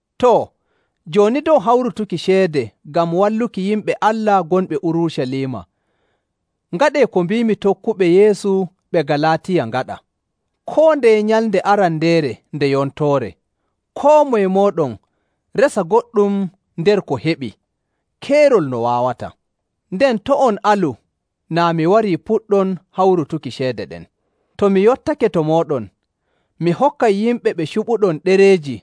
Too, jooni dow hawrutuki ceede ngam walluki yimɓe Allah gonɓe Urucaliima, ngaɗee ko mbiimi tokkuɓe Yeesu ɓe Galaatiya ngaɗa. Koo ndeye nyalnde arandeere nde yontoore, koo moye mooɗon resa goɗɗum nder ko heɓii keerol no waawata. Nden to' on alu naa mi warii puɗɗon hawrutuki ceede ɗen. To mi yottake to mooɗon, mi hokkay yimɓe ɓe cuɓuɗon ɗereeji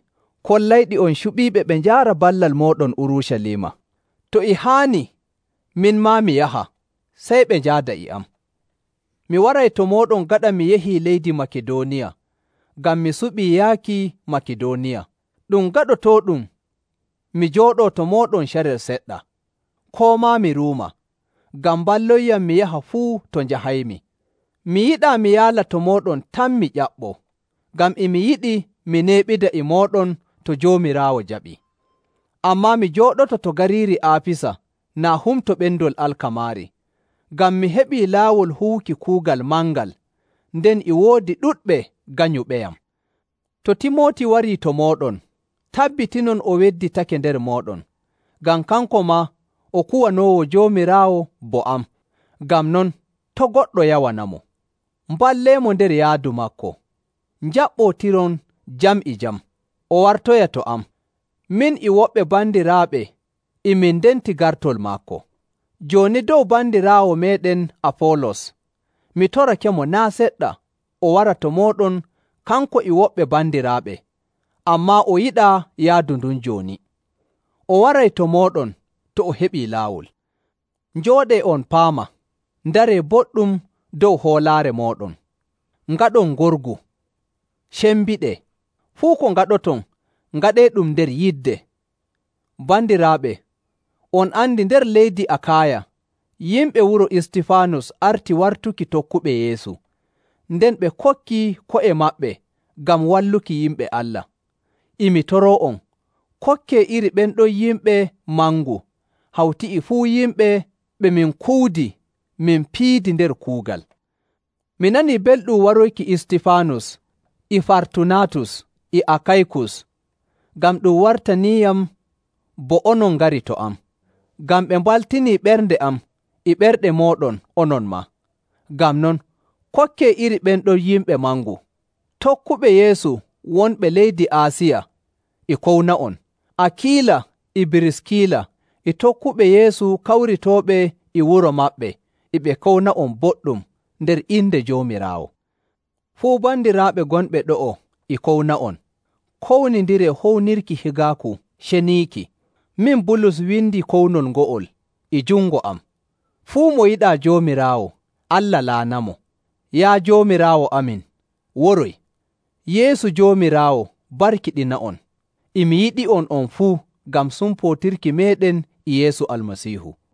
kollayɗi on cuɓiiɓe ɓe njaara ballal mooɗon Urucaliima. To e haani min maa mi yaha, sey ɓe njaada e am. Mi waray to mooɗon gaɗa mi yahii leydi Makidooniya, ngam mi suɓii yaaki Makidooniya. Ɗum gaɗotooɗum mi jooɗoo to mooɗon carel seɗɗa, koo maa mi ruuma, ngam mballonyam mi yaha fuu to njahaymi. Mi yiɗaa mi yaala to mooɗon tan mi ƴaɓɓoo, ngam e mi yiɗi mi neeɓida e mooɗon to Joomiraawo jaɓii. Ammaa mi jooɗoto to gariiri Aafisa naa Humto Ɓendol Alkamaari, ngam mi heɓii laawol huwuki kuugal mangal, nden e woodi ɗuɗɓe ganyuɓeyam. To Timooti warii to mooɗon, tabbitinon o wedditake nder mooɗon, ngam kanko maa o kuwanoowo Joomiraawo bo am. Ngam non, to' goɗɗo yawanamo. Mballeemo nder yaadu maako, njaɓɓootiron jam e jam, o wartoya to am. Min e woɓɓe bandiraaɓe e min ndenti gartol maako. Jooni dow bandiraawo meeɗen Afoolos, mi torakemo naa' seɗɗa o wara to mooɗon kanko e woɓɓe bandiraaɓe, ammaa o yiɗaa yaadu ndun jooni. O waray to mooɗon to o heɓii laawol. Njooɗee on paama, ndaree boɗɗum dow hoolaare mooɗon, ngaɗon ngorgu, cembiɗee. Fuu ko ngaɗoton, ngaɗeeɗum nder yidde. Bandiraaɓe, on andi nder leydi Akaaya yimɓe wuro Istifaanus arti wartuki tokkuɓe Yeesu, nden ɓe kokkii ko'e maɓɓe ngam walluki yimɓe Allah. E mi toroo'on kokkee iri ɓen ɗon yimɓe mangu hawti e fuu yimɓe ɓe min kuwidi min piidi nder kuugal. Mi nanii belɗum waroyki Istifaanus, e Fartunaatus, e Akaykus, ngam ɗum wartaniiyam bo onon ngari to am, ngam ɓe mbaltinii ɓernde am e ɓerɗe mooɗon onon maa. Ngam non, kokkee iri ɓen ɗon yimɓe mangu. Tokkuɓe Yeesu wonɓe leydi Aasiya e kowna'on. Akiila, e Biriskila, e tokkuɓe Yeesu kawritooɓe e wuro maɓɓe e ɓe kowna'on boɗɗum nder inde Joomiraawo. Fuu bandiraaɓe gonɓe ɗo'o e kowna'on. Kownindiree hownirki higaaku ceniiki. Min Bulus windi kownol ngo'ol e jungo am. Fuu mo yiɗaa Joomiraawo, Allah laanamo. Yaa Joomiraawo amin, waroy! Yeesu Joomiraawo barkiɗina'on. E mi yiɗi'on on fuu ngam sumpootirki meeɗen e Yeesu Almasiihu.